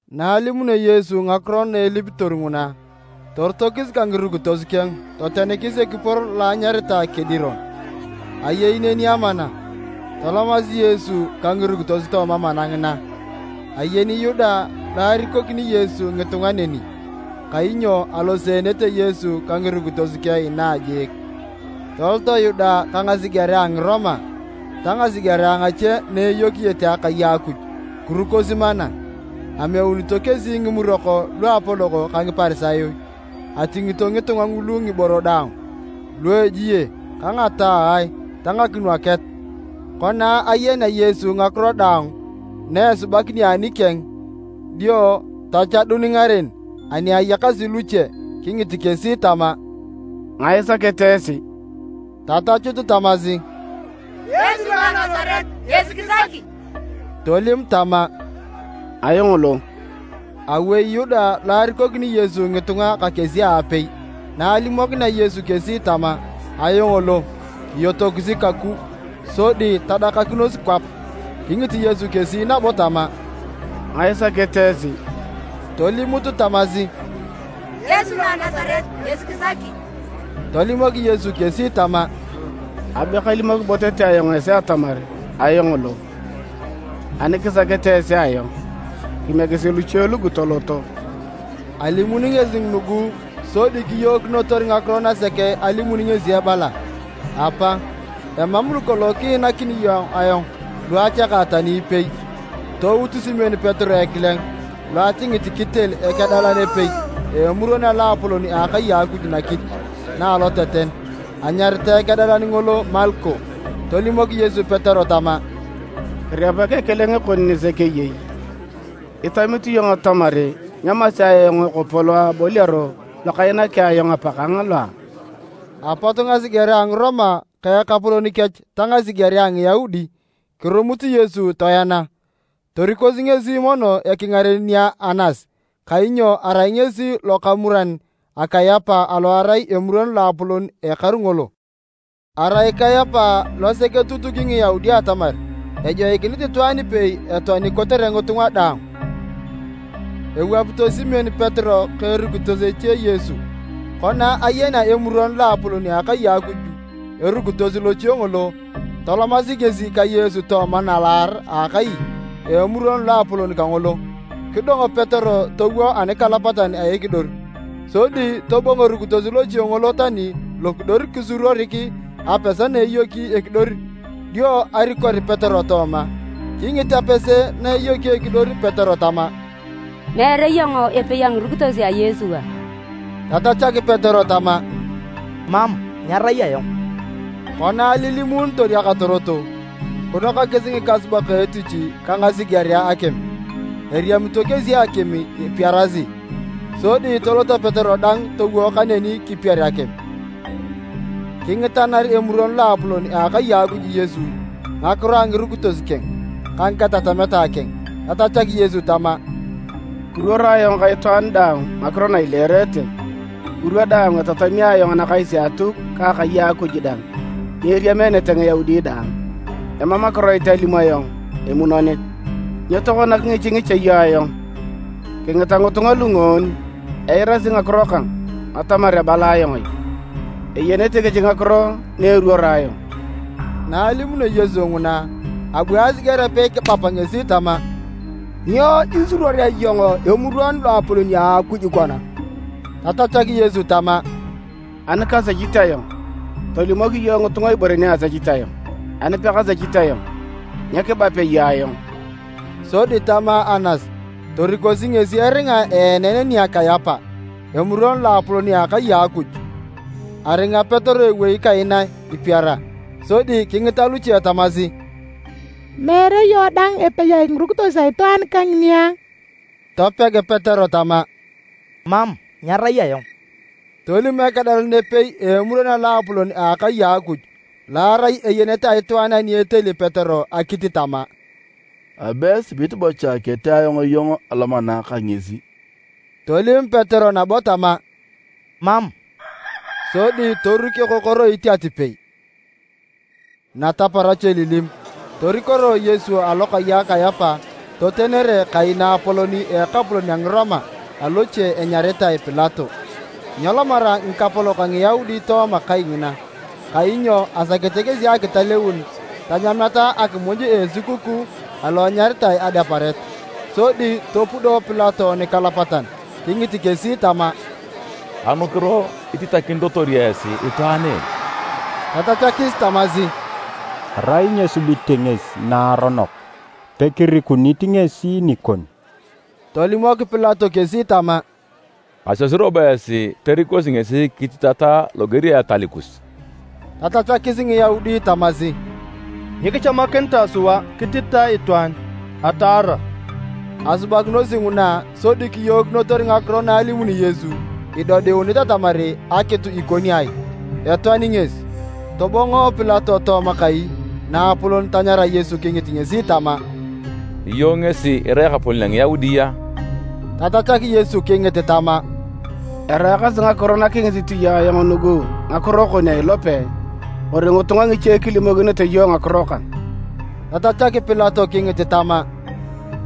Na alimunio Yesu ngakiro na elipitor nguna, torotokis ka ngirukitos keng totenikis ekipor lo enyaritae Kediron. Ayei neni amana, tolomasi Yesu ka ngirukitos tooma mana ngina. Ayeni Yuda lo arikokini Yesu ngitunga neni, kainyo aloseenete Yesu ka ngirukitos keng inaa jiik. Toloto Yuda ka ngasigerea a Ngiroma ta ngasigerea ngache naeyokiyete akai a Akuj, kirukosi mana. Ameunito kesi ngimurok luapolok ka Ngiparisayo. Atingito ngitunga ngulu ngiboro daang luejie ka ngataae ta ngakinwaket. Kona ayenea Yesu ngakiro daang na esubakinio anikeng, dio tachadun ngaren ani ayakasi luche kingit kesi tama, “Ngae isakete esi?” Tatachut tamasi, “Yesu lo a Nasaret, ngesi kisaki.” Tolim tama, “Ayong lo.” Awei Yuda lo arikokini Yesu ngitunga ka kesi aapei. Na alimokinea Yesu kesi tama, “Ayong lo,” kiyotosi kaku sodi tadakakinos kwap. Kingit Yesu kesi nabo tama, “Ngae isakete esi?” Tolimut tamasi, “Yesu lo a Nasaret ngesi kisaki.” Tolimok Yesu kesi tama, “Abe kalimok bo tete ayong esi atamar ayong lo. Ani kisakete esi ayong, kimiekisi luche lugu toloto.” ( Alimuni ngesi nugu sodi kiyookinotor ngakiro nasek alimuni ngesi ebala, “Apa, emam lukolong kiinakini iyong ayong luachaka tani ipei.”) Tout Simon Petero ekileng lo atingit kitel ekedalan epei a Emuron a Loapolon a akai a Akuj nakit na aloteten. Anyaritae ekedalan ngolo Malko. Tolimok Yesu Petero tama, “Kirepak ekileng kon nisek eyei! Itamit iyong atamar nyamasea ayong ekopo lo aboliaro lokainaki ayong Apakang loa?” Apot ngasigerea a Ngiroma ka ekapolon kech ta ngasigerea a Ngiyaudi kirumut Yesu toena, torikosi ngesi mono ekingaren nia Anas kainyo arai ngesi lokamuran a Kayapa alo arai Emuron Loapolon ekaru ngolo. Arai Kayapa losek etutuki Ngiyaudi atamar ejoikinit itwaan ipei etoani kotere ngitunga daang. Ewapito Simon Petero ka erukitos eche Yesu. Kona ayenea Emuron Loapolon a akai a Akuj erukitos loche ngolo, tolomasi ngesi ka Yesu tooma nalaar a akai a Emuron a Loapolon kangolo. Kidong Petero towo anikalapatan a ekidor. Sodi tobongo erukitos loche ngolo tani lokidor kisuruorik apese na eyoki ekidor dio arikor Petero tooma. Kingit apese na eyoki ekidor Petero tama, “Meere iyong epei a ngirukitos a Yesu a?” Tatachak Petero tama, “Mam, nyarai ayong.” Kona alilimuunitor akatorot, kinokakis ngikasubak etich ka ngasigerea akim. Eriamito kesi akim ipiarasi. Sodi tolot Petero dang towo kaneni kipier akim. Kingitana Emuron Loapolon a akai a Akuj Yesu ngakiro a ngirukitos keng ka ngakitatamet keng. Tatachak Yesu tama, “Kiruoro ayong ka itwaan daang ngakiro na ileerete, ngirwa daang etatami ayong anakais a Atuk ka akai a Akuj dang ni eriameenete Ngiyaudi daang. Emam akiroit alim ayong emunonit. Nyo tokona kingichingicha iyong ayong? Kingita ngitunga lungoon eirasi ngakiro kang atamar abala ayong ai. Eyenete kesi ngakiro na eruoro ayong.” Na alimunio Yesu nguna, abu asiger apei kibap ngesi tama, “Nyo isuruorea iyong Emuron Loapolon a Akuj kona?” Tatachak Yesu tama. “Ani kasechit ayong, tolimok iyong ngitunga ibore ni asechit ayong. Ani pekasechit ayong, nyo kibapea iyong ayong?” Sodi tama Anas torikosi ngesi eringa eenen nia Kayapa, Emuron Loapolon a akai a Akuj. Aringa Petero ewei kaina ipiara. Sodi kingita luche tamasi, “Meere iyong dang epei a ngirukitos a itwaan kangini a?” Topeg Petero tama, “Mam, nyarai ayong.” Tolim ekedalan epei a Emuron a Loapolon a akai a Akuj lo arai eyenet a itwaan ani eteli Petero akit tama, “Abe esibit bocha ketee ayong iyong alomana ka ngesi?” Tolim Petero nabo tama, “Mam”, sodi toruk ekokoroit atipei. Nataparach elilim, torikoroe Yesu alokai a Kayapa totenere kai naapolon a Ekapolon a Ngiroma aloochi enyaritae Pilato. Nyelomara ngikapolok a Ngiyaudi tooma kai ngina kainyo asakete kesi akitaleun tanyameta akimuj a esukukuu alo enyaritae Adeparet. Sodi topudo Pilato nikalapatan kingit kesi tama, “Anukiro ititakinitotor esi itwaan en?” Tatachakis tamasi, “Arai nyesubite ngesi naaronok, pekirikunit ngesi nikon.” Tolimok Pilato kesi tama, “Kasiosi robo esi torikosi ngesi kititata loger a etal kus.” Tatachakis Ngiyaudi tamasi, “Nyikichamakinitae sua kititae itwaan ataara.” ( Asubakinosi nguna sodi kiyookinotor ngakiro na alimuni Yesu idodiunit atamar akitu ikoni ai, etoani ngesi.) Tobongo Pilato tooma kai naapolon tanyara Yesu kingit ngesi tama, “Iyong ngesi irai ekapolon a Ngiyaudi a?” Tatachak Yesu kingit tama, “Eraakasi ngakiro nakingisit iyong ayong nugu ngakiro kon a ilope, kori ngitunga ngiche kilimokinete iyong ngakiro kang?” Tatachak Pilato kingit tama,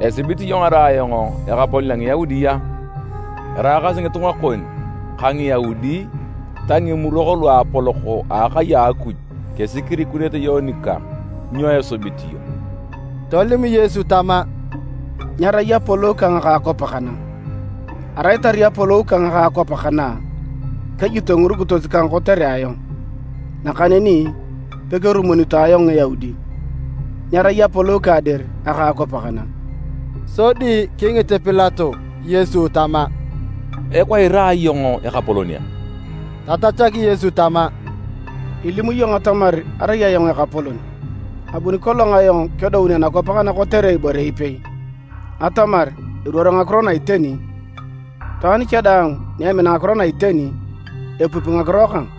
“Esibit iyong arai ayong Eyaudit a? Eraakasi ngitunga kon ka Ngiyaudi ta Ngimurok Luapolok a akai a Akuj kesi kirikunete iyong nikang. Nyo isubit iyong?” Tolim Yesu tama, “Nyerai apolou kang aka akwap kana. Arai tarai apolou kang aka akwap kana, kejito ngirukitos kang kotere ayong, nakaneni pekerumunito ayong Ngiyaudi. Nyerai apolou kang dir aka akwap kana!” Sodi kingit Pilato Yesu tama, “Ikwa irai iyong ekapolon a?” Tatachak Yesu tama, “Ilimu iyong atamar arai ayong ekapolon. Abuni kolong ayong kedoun anakwap kana kotere ibore ipei, atamar eruor ngakiro na iteni. Itwaan cha daang ni emina ngakiro na iteni, epupi ngakiro kang.”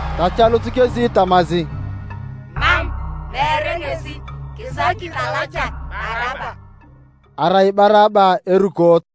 Tachalut kesi tamasi, “Mam, meere ngesi, kisaki talachak Baraba!” (Arai Baraba erukoot.)